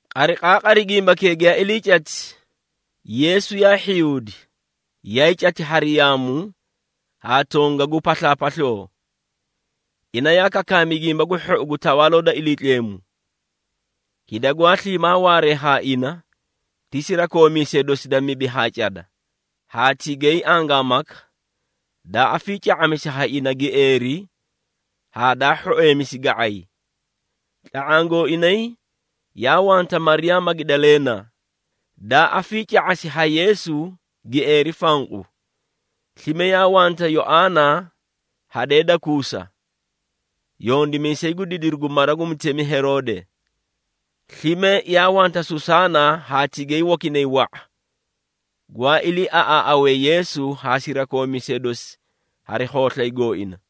Qariqaaqari gimbakee giyaa ilii cati, Yeesu yaa hhiyuudi, yaay cati hari yaamu haa tongagu paslaapasloo. Ina yaa kakaami Gimba gu Hhou gu Tawaaloo da Iliitleemu. Hida gwaa sliimaa waaree haa ina, ti sirakoomiisee dosi da mibi haa cada, haa tigay angaamaka, daa afiica⁄amisi haa ina gieeri haa daa hhoeemisi ga⁄ay. Tla⁄aã gooinay yaa wanta Mariyaa Magidaleena, daa afiica⁄asi ha Yeesu gieeri fanqu. Slime yaa wanta Yoaana hadee da Kuusa, yondimiisay gu didiru gu mara gu mutemi Heroode. Slime yaa wanta Susaana haa tigay wakinay wa⁄a, gwaa iliiaꞌaaꞌawee Yeesu haa sirakoomiisee dosi hari khooslay gooina.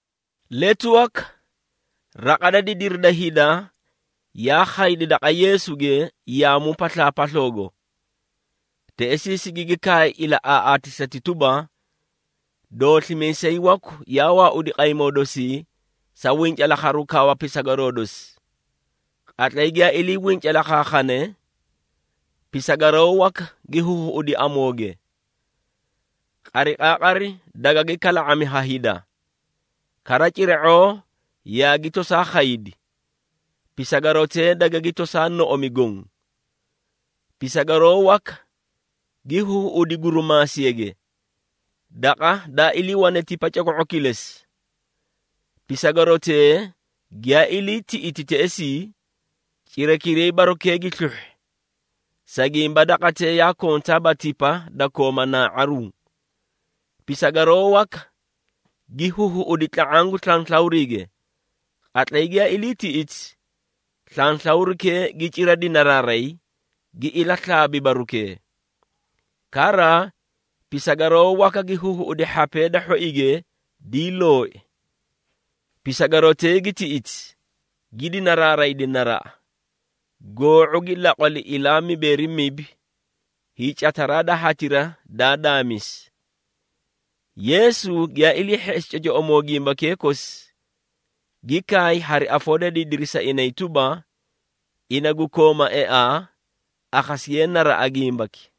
Letu waka raqa da didiri da hida yaa khaydi daqa Yeesuge yaamu paslaapasloogo. Teꞌesii sigigi kaay ilaꞌaaꞌaatisati tuba, “Dooslimiisay waku yaa waaudi qaymoo dosii sa wincalaakharu kawa pisagaroo dosi. Qatlay giyaa ilii wincalaakhaakhane, pisagaroo waka gi huhuꞌudi amooge. Qariqaaqari dagagi kala⁄ami ha hida, kara cira⁄oo yaagi tosaa khaydi, pisagarotee dagagi tosaa noꞌomi goõ. Pisagaroo waka gi huhuꞌudi gurumaasiyage, daqa daa iliiwane tipa coko⁄o kilesi. Pisagarotee giyaa ilii tiꞌiti teꞌesii, cirakiray barukee gi sluhhi, sa gimba daqatee yaa kontaaba tipa da kooma naa⁄aruũ. Pisagaroo waka gi huhuꞌudi tla⁄aã gu slanslawriige. Qatlay giyaa ilii tiꞌiti, slanslawrikee gi cira dinaraaray, gi ilaslaabi barukee. Kara, pisagaroo waka gi huhuꞌudi hhapee da hhoige dii looi. Pisagarotee gi tiꞌiti, gi dinaraaraydi naraꞌa, goo⁄u gi laqwali ilaa waa mibeeri mibi, hiicataraa da hatira daa daamisi.” Yeesu giyaa ilii hheꞌesi cocoꞌomoo gimbakee kosi, gi kaay hari afoo da didiri sa inay tuba, “Ina gu kooma eaa, akhasiye naraꞌa gimbaki.”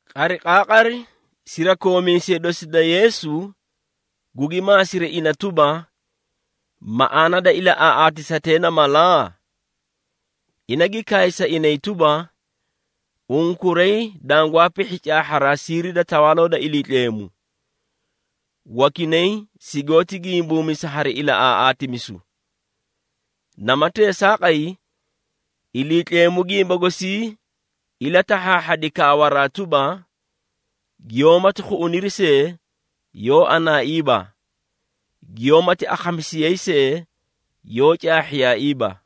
Qariqaaqari sirakoomiisee dosi da Yeesu gugi maasiri ina tuba, “Maꞌaana da ilaꞌaaꞌaatisatee na mala?” Ina gi kaay sa inay tuba, “Unkuray dangwaa pihhi caahharaa siiri da Tawaaloo da Iliitleemu. Wakinay sigoóti gimbuumisa hari ilaꞌaaꞌaatimisu. Nama teesaaqay, Iliitleemu gimba gosii ilatahhaahhadi, kaawaraa tuba, ‘Giyoómati khuꞌuniri see, yoó anaaiiba, Giyoómati akhamisiyayi see, yoó caahhiyaaiiba.’”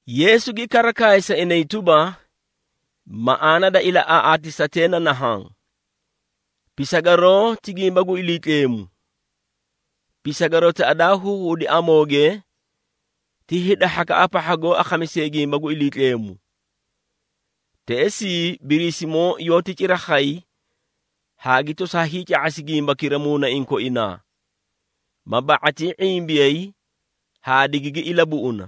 Yeesu gi kara kaay sa inay tuba, “Maꞌaana da ilaꞌaaꞌaatisatee na nahaã: Pisagaroo ti gimba gu Iliitleemu. Pisagarotaꞌa daa huhuꞌudi amooge, ti hida hhakaꞌa pahha goó akhamisee gimba gu Iliitleemu. Teꞌesii Biriisimoo yoóti cira khay haa gi tosaa hiica⁄asi gimbakira muunaiĩ koinaa, maa ba⁄atii ⁄imbiyay haa digigi ilabuꞌuna.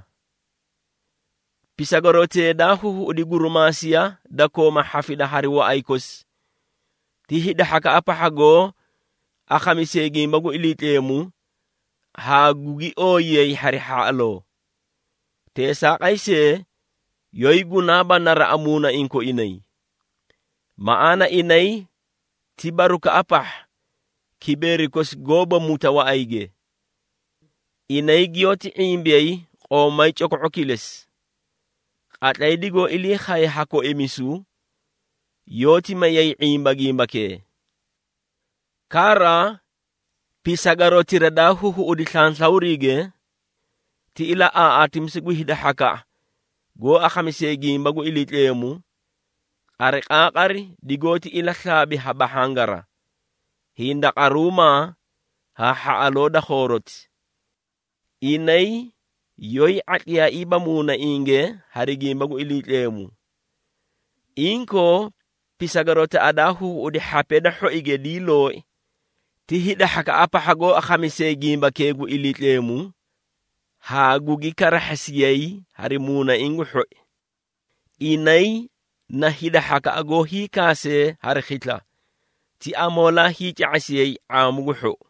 Pisagarotee daa huhuꞌudi gurimaasiya da kooma hhafida hari waꞌay kosi, ti hida hhakaꞌa pahha goó akhamisee gimba gu Iliitleemu haa gugi ooyiyayi hari hhaꞌaloo. Teesaaqay see, yoóyi gunaaba naraꞌa muunaiĩ koinay. Maꞌaana inay ti barukaꞌa pahha, kibeeri kosi goóba muta waꞌayge. Inay giyoóti ⁄imbiyay qoomay coko⁄o kilesi. Qatlay digoó ilii khaye ha koimisu, yoóti mayay ⁄imba gimbakee. Kara, pisagarotira daa huhuꞌudi slanslawriige, ti ilaꞌaaꞌaatimisu gu hida hhakaꞌa, goó akhamisee gimba gu Iliitleemu, qariqaaqari digoóti ilaslaabi ha bahhangara, hindaqaruumaa haa hhaꞌaloo da khooroti. Inay yoóyi ⁄atliyaaiiba muunainge hari gimba gu Iliitleemu. Inkoo, pisagarotaꞌa daa huhuꞌudi hhapee da hhoige dii looi, ti hida hhakaꞌa pahha goó akhamisee gimbakee gu Iliitleemu haa gugi karahhasiyay hari muunaiĩ gu hhoi. Inay na hida hhakaꞌa goó hiikaasee hari khisla, ti amoolaa hiica⁄asiyay ⁄aamu gu hhou.”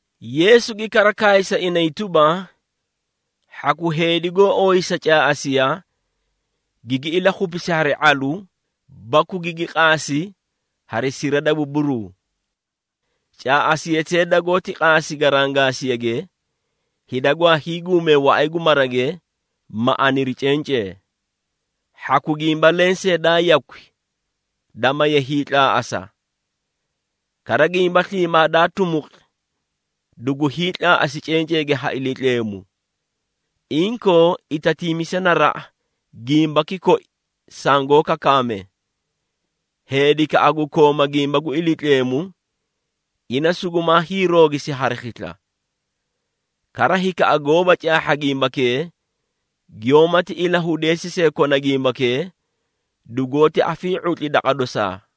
Yeesu gi kara kaay sa inay tuba, “Hhaku heedi goó ooyisa caaꞌasiya, gigi ilakhupisi hari ⁄alu baku gigi qaasi hari sira da buburuu. Caaꞌasiyatee dagoóti qaasi garangaasiyage, hida gwaa hiiguumee waꞌay gu marage, ma aniri cencee. Hhaku gimba lensee daa yakwi, da maye hiitlaaꞌasa. Kara gimba sliimaa daa tumuqi, dugu hiitlaaꞌasi cenceege ha Iliitleemu. Inkoo, itatiimisa naraꞌa gimbaki koi sangoó kakaame. Heedikaꞌa gu kooma gimba gu Iliitleemu, ina sugumaa hiiroogisi hari khisla. Kara hikaꞌa goóba caahha gimbakee, giyoómati ilahudeesi see kona gimbakee, dugoóti afii⁄utli daqa dosaa.”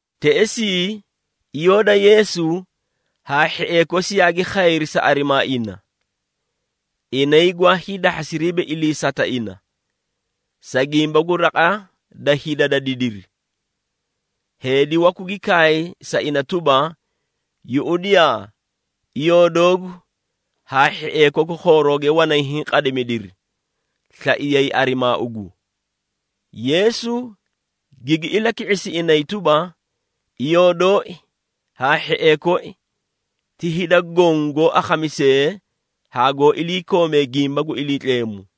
Teꞌesii iyoo da Yeesu haa hhiee kosi yaagi khayri sa arimaa ina. Inay gwaa hiidahhasiriiba iliisata ina, sa gimba gu raqa da hida da didiri. Heedi waku gi kaay sa ina tuba, “Yuꞌudiyaa, iyoo doogu haa hhiee koku khoorooge wanay hiĩ qadimidiri, slaiyay arimaa ugu.” Yeesu gigi ilaki⁄isi inay tuba, “Iyoo dooi haa hhiee koi, ti hida goõ goó akhamisee haa goó iliikoomee gimba gu Iliitleemu.”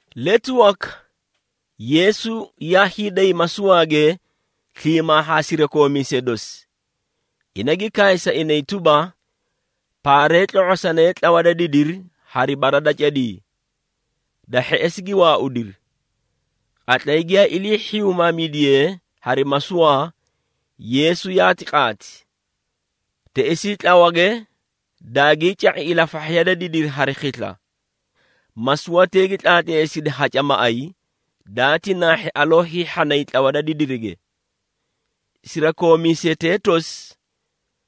Letu waka Yeesu yaa hiiday masuwaage sliimaa haa sirakoomiisee dosi. Ina gi kaay sa inay tuba, “Paaree, tlo⁄osanee tlawa da didiri hari bara da cadii.” Da hheꞌesi gi waaudiri. Qatlay giyaa ilii hhiyumaamidiyee hari masuwaa, Yeesu yaati qaati. Teꞌesii tlawage daagii ca⁄i ilafahhiya da didiri hari khisla. Masuwatee gi tlaatleesidi haca maꞌay, daati naahhi aloo hiihhanay tlawa da didirige. Sirakoomiisetee tosi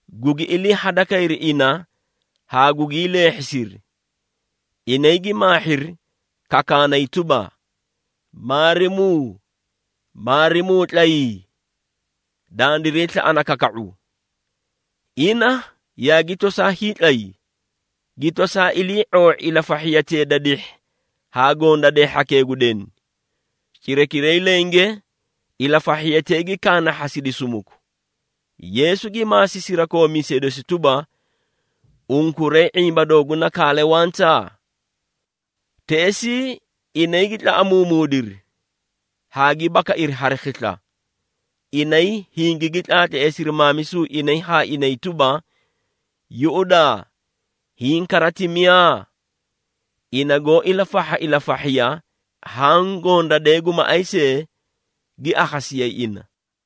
gugi ilii hadakayri ina haa gugii leehhisiri. Inay gi maahhiri, kakaanay tuba, “Maarimuu, Maarimuu tlayii! Dandiray slaꞌana kaka⁄u!” Ina yaagi tosaa hiitlay, gi tosaa ilii⁄oo⁄i ilafahhiyatee da dihhi haa gondadee hhakee gu deni. Cirakiray lenge ilafahhiyatee gi kaanahhasidi sumuku. Yeesu gi maasi sirakoomiisee dosi tuba, “Unkuray ⁄imba dooguna kaale wanta?” Teꞌesii inay gi tlaꞌamuumuudiri haa gi bakairi hari khisla. Inay hingigi tlaatleesiri maamisu inay haa inay tuba, “Yuꞌudaa, hiĩ kara ti miyaa? Ina goó ilafahha ilafahhiya haã gondadee gu maꞌay see, gi akhasiyayi ina!”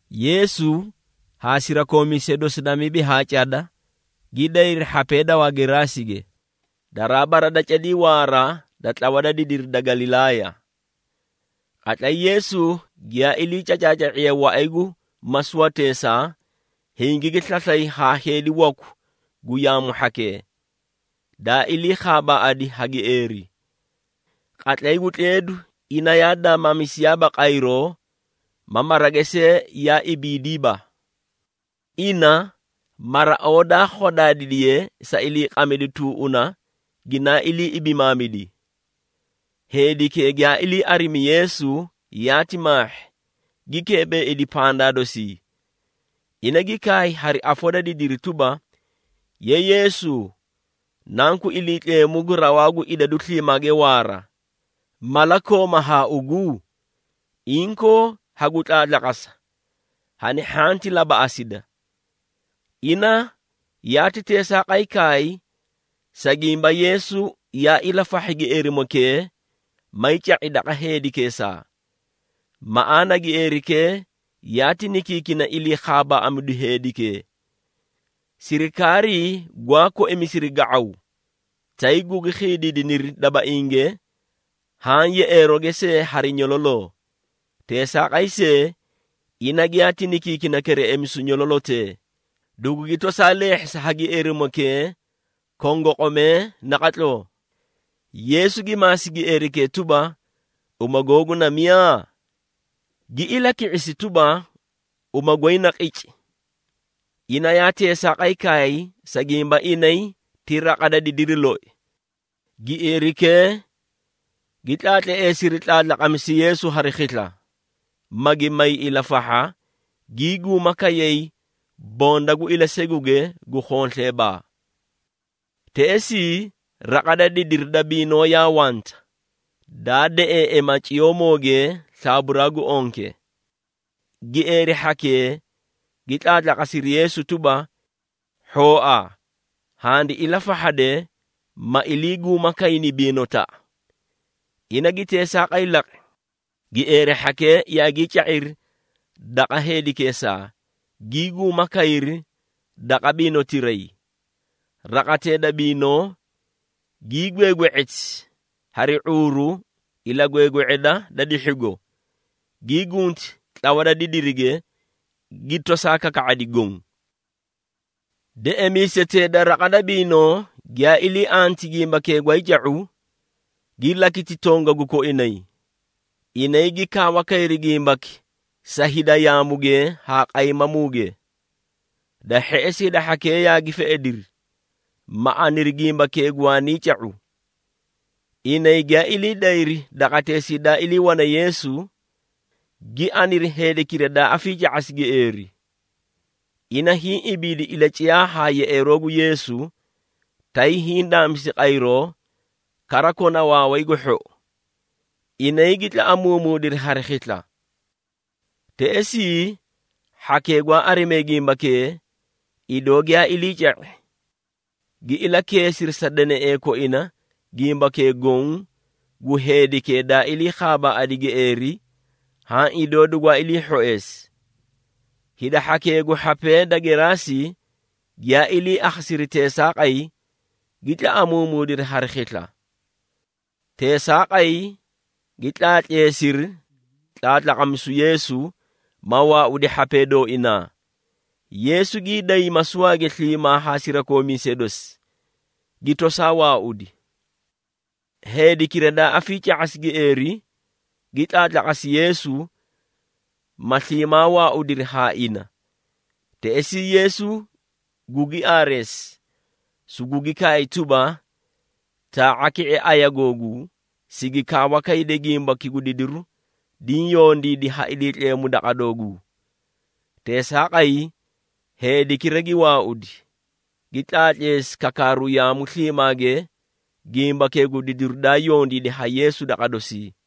Yeesu haa sirakoomiisee dosi da mibi haa cada gi dayri hhapee da Wageraasige, daraa bara da cadii waara da tlawa da didiri da Galilaaya. Qatlay Yeesu giyaa ilii cacaaca⁄iye waꞌay gu masuwateesaa, hingigi slaslay haa heedi waku gu yaamu hhakee, daa ilii khaabaaꞌadi ha gieeri. Qatlay gu tleedu ina yaa daamaamisiyaaba qayro ma marage see yaa ibidiiba. Ina, maraoo daa khodaadiye sa iliiqamidu tuuꞌuna, ginaa ilii ibimaamidi. Heedikee giyaa ilii arimi Yeesu, yaati maahhi, gi keebeeidi pandaa dosii. Ina gi kaay hari afoo da didiri tuba, “Ye Yeesu, Nanku Iliitleemu gu Rawaa gu Idadu Sliimaage Waara, mala kooma haa ugu? Inkoo hagu tlaatlaqasa, hani hhanti labaꞌasida!” Ina yaati teesaaqay kaay, sa gimba Yeesu yaa ilafahhi gieerimokee, may ca⁄i daqa heedikeesaa. Maꞌaana gieerikee yaati nikiikina ilii khaabaaꞌamidu heedikee. Sirikaarii gwaa koimisiri ga⁄aw, tay gugi khiidiidiniri dabainge haã yeꞌeerooge see hari nyololoo. Teesaaqay see, ina giyaati nikiikina kereꞌemisu nyololotee, dugugi tosaa leehhisi ha gieerimokee kongoqomee naqatloo. Yeesu gi maasi gieerikee tuba, “Uma googu na miyaa?” Gi ilaki⁄isi tuba, “Uma goy na ‘Qici.’” Ina yaa teesaaqay kaay, sa gimba inay ti raqa da didiri loi. Gieerikee gi tlaatleesiri tlaatlaqamisu Yeesu hari khisla, magi may ilafahha, gii guuma kayay bonda gu ilaseguge gu khonsleebaa. Teꞌesii raqa da didiri da biinoo yaa wanta, daa deꞌeeꞌema ciyoomooge slaaburaa gu onke. Gieeri hhakee gi tlaatlaqasiri Yeesu tuba, “Hhooa handi ilafahhade, ma iliiguuma kayni biinotaꞌa.” Ina gi teesaaqay laqi, gieeri hhakee yaagii ca⁄iri daqa heedikeesaa, gii guuma kayri daqa biinotiray. Raqatee da biinoo, gii gweegwe⁄eti hari ⁄uuru ilagweegwe⁄eda da dihhigo, gii gunti tlawa da didirige, gi tosaa kaka⁄adi goõ. Deꞌemiisetee da raqa da biinoo giyaa ilii anti gimbakee gwaay ca⁄u, gi lakiti tongagu koinay. Inay gi kaawa kayri gimbaki sa hida yaamuge haa qaymamuuge. Da hheꞌesi hida hhakee yaagi feꞌediri, ma aniri gimbakee gwaanii ca⁄u. Inay giyaa ilii dayri daqateesii daa iliiwane Yeesu, gi aniri heedikira daa afiica⁄asi gieeri. Ina hiĩ ibiidi ilaciyaa haa yeꞌeeroo gu Yeesu, tay hiĩ daamisi qayroo, kara kona waaway gu hhou! Inay gi tlaꞌamuumuudiri hari khisla. Teꞌesii, hhakee gwaa arimee gimbakee, idoo giyaa ilii ca⁄i, gi ilakeesiri sa deneꞌee koina gimbakee goõ gu heedikee daa ilii khaabaaꞌadi gieeri haã idoo dugwaa ilii hhoeesi. Hida hhakee gu hhapee da Geraasi giyaa ilii akhasiri teesaaqay, gi tlaꞌamuumuudiri hari khisla. Teesaaqay gi tlaatleesiri tlaatlaqamisu Yeesu, ma waaudi hhapee dooinaa! Yeesu gii day masuwaage sliimaa haa sirakoomiisee dosi, gi tosaa waaudi. Heedikira daa afiica⁄asi gieeri, gi tlaatlaqasi Yeesu, ma sliimaa waaudiri haa ina. Teꞌesii Yeesu gugi aareesi, sugugi kaay tuba, “Taa⁄a ki⁄e aya googuu, sigi kaawa kayde gimbaki gu didiru diĩ yondiidi ha Iliitleemu daqa dooguu.” Teesaaqay, heedikira gi waaudi, gi tlaatleesi kakaaru yaamu sliimaage gimbakee gu didiru daa yondiidi ha Yeesu daqa dosii.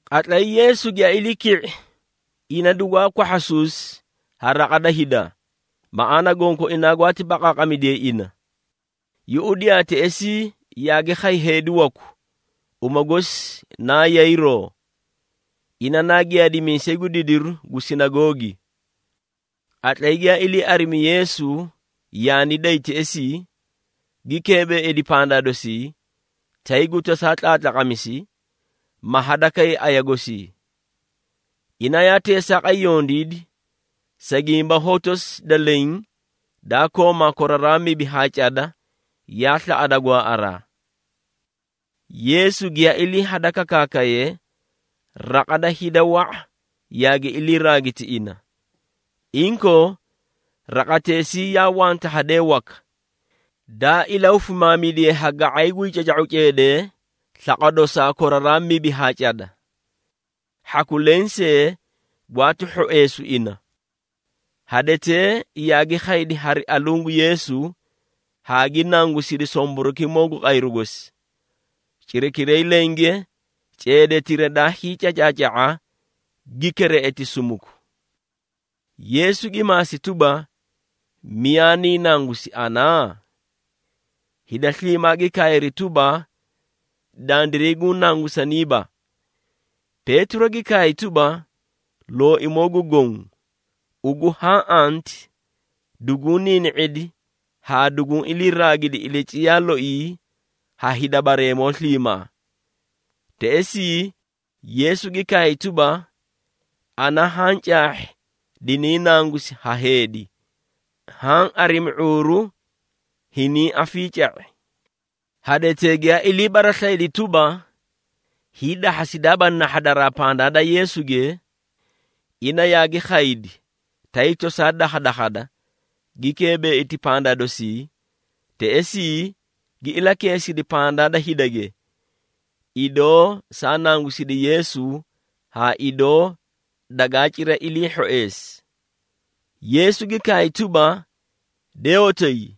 Qatlay Yeesu giyaa ilii ki⁄i ina dugwaa kwahhasuusi ha raqa da hida, maꞌaana gonkoinaa gwaati baqaaqamidiyayi ina. Yuꞌudiyaa, teꞌesii yaagi khay heedi waku, uma gosi naa Yayiroo, ina naa giyaadimiisay gu didiru gu sinagoogi. Qatlay giyaa ilii arimi Yeesu yaani day teꞌesii, gi keebeeidi pandaa dosii, tay gu tosaa tlaatlaqamisi, ma hadakay aya gosii. Ina yaa teesaaqay yondiidi, sa gimba hotosi da leẽ, daa kooma koraraa mibi haa cada, yaa slaꞌada gwaaꞌaraa! Yeesu giyaa ilii hada kakaakaye, raqa da hida wa⁄a yaagi ilii raagiti ina. Inkoo, raqateꞌesii yaa wanta hadee waka, daa ilahufimaamidiye ha ga⁄ay gwii caca⁄uu ceedee slaqwa dosaa koraraa mibi haa cada. Hhaku lensee gwaati hhoeesu ina. Hadetee yaagi khaydi hari aluũ gu Yeesu haa gi nangusidi somborokimoo gu qayru gosi. Cirakiray lenge ceedetira daa hiicacaaca⁄a gi kereꞌeti sumuku. Yeesu gi maasi tuba, “Miyaa niĩ nangusi ana?” Hida sliimaa gi kaayri tuba, “Dandiray guũ nangusaniiba.” Peetiro gi kaay tuba, “Looimoo gu Goõ, ugu haã anti, duguũ niini⁄idi haa duguũ iliiraagidi ilaciyaa looi ha hida bareemoo sliimaa.” Teꞌesii, Yeesu gi kaay tuba, “Ana haã caahhi diniĩ nangusi ha heedi, haã arimi ⁄uuru hiniĩ afiica⁄i.” Hadetee giyaa ilii baraslayidi tuba, hiidahhasidaaba nahhadaraa pandaa da Yeesuge, ina yaagi khaydi, tay tosaa dakhadakhada, gi keebeeiti pandaa dosii. Teꞌesii gi ilakeesidi pandaa da hidage, idoo saa nangusidi Yeesu haa idoo dagaa cira ilii hhoeesi. Yeesu gi kaay tuba, “De hotoyi,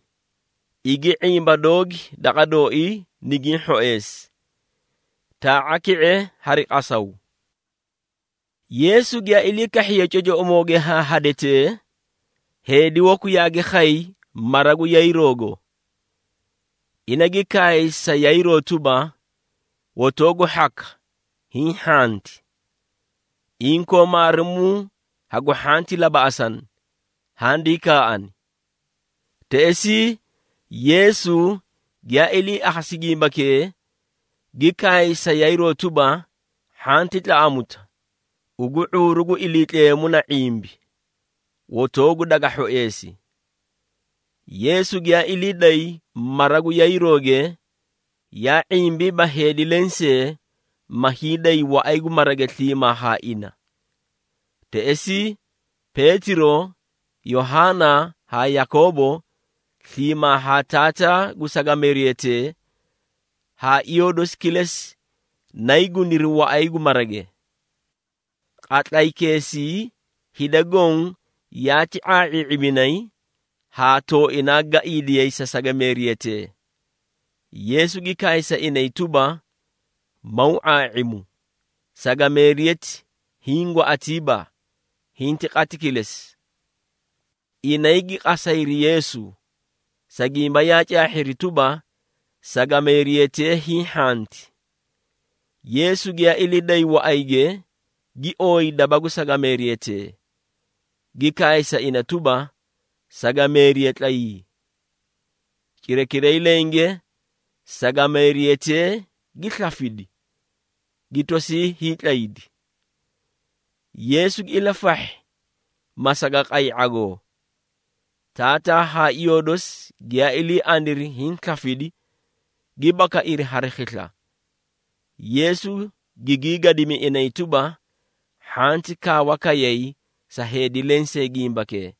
igi ⁄imba doogi daqa dooii nigiĩ hhoeesi. Taa⁄a ki⁄e hari qasaw.” Yeesu giyaa ilii kahhiye cocoꞌomooge haa hadetee, heedi waku yaagi khay mara gu Yayiroogo. Ina gi kaay sa Yayiroo tuba, “Hotoogu hhaka, hiĩ hhanti. Inkoo, maarimuu hagu hhanti labaꞌasana, handii kaaꞌani.” Teꞌesii Yeesu giyaa ilii akhasi gimbakee, gi kaay sa Yayiroo tuba, “Hhanti tlaꞌamuta, ugu ⁄uuru gu Iliitleemu na ⁄imbi, hotoogu daga hhoeesi.” Yeesu giyaa ilii day mara gu Yayirooge, yaa ⁄imbiiba heedi lensee, ma hiiday waꞌay gu marage sliimaa haa ina. Teꞌesii Peetiro, Yohaana haa Yakoobo, sliimaa haa taataa gu sagameeriyatee haa iyoo dosi kilesi nayii guniri waꞌay gu marage. Qatlaykeesii hida goõ yaati ⁄aa⁄ii⁄iminay haa tooinaa gaiidiyay sa sagameeriyatee. Yeesu gi kaay sa inay tuba, “Maw ⁄aa⁄imu. Sagameeriyati hiĩ gwaꞌatiiba, hinti qati kilesi.” Inay gi qasayri Yeesu, sa gimba yaa caahhiri tuba, sagameeriyatee hiĩ hhanti. Yeesu giyaa ilii day waꞌayge, gi ooyi daba gu sagameeriyatee, gi kaay sa ina tuba, “Sagameeriya, tlayii!” Cirakiray lenge, sagameeriyatee gi slafidi, gi tosii hiitlaydi. Yeesu gi ilafahhi ma saga qay ⁄agoo. Taataa haa iyoo dosi giyaa ilii aniri hiĩ slafidi, gi bakairi hari khisla. Yeesu gigii gadimi inay tuba, hhanti kaawa kayay sa heedi lensee gimbakee.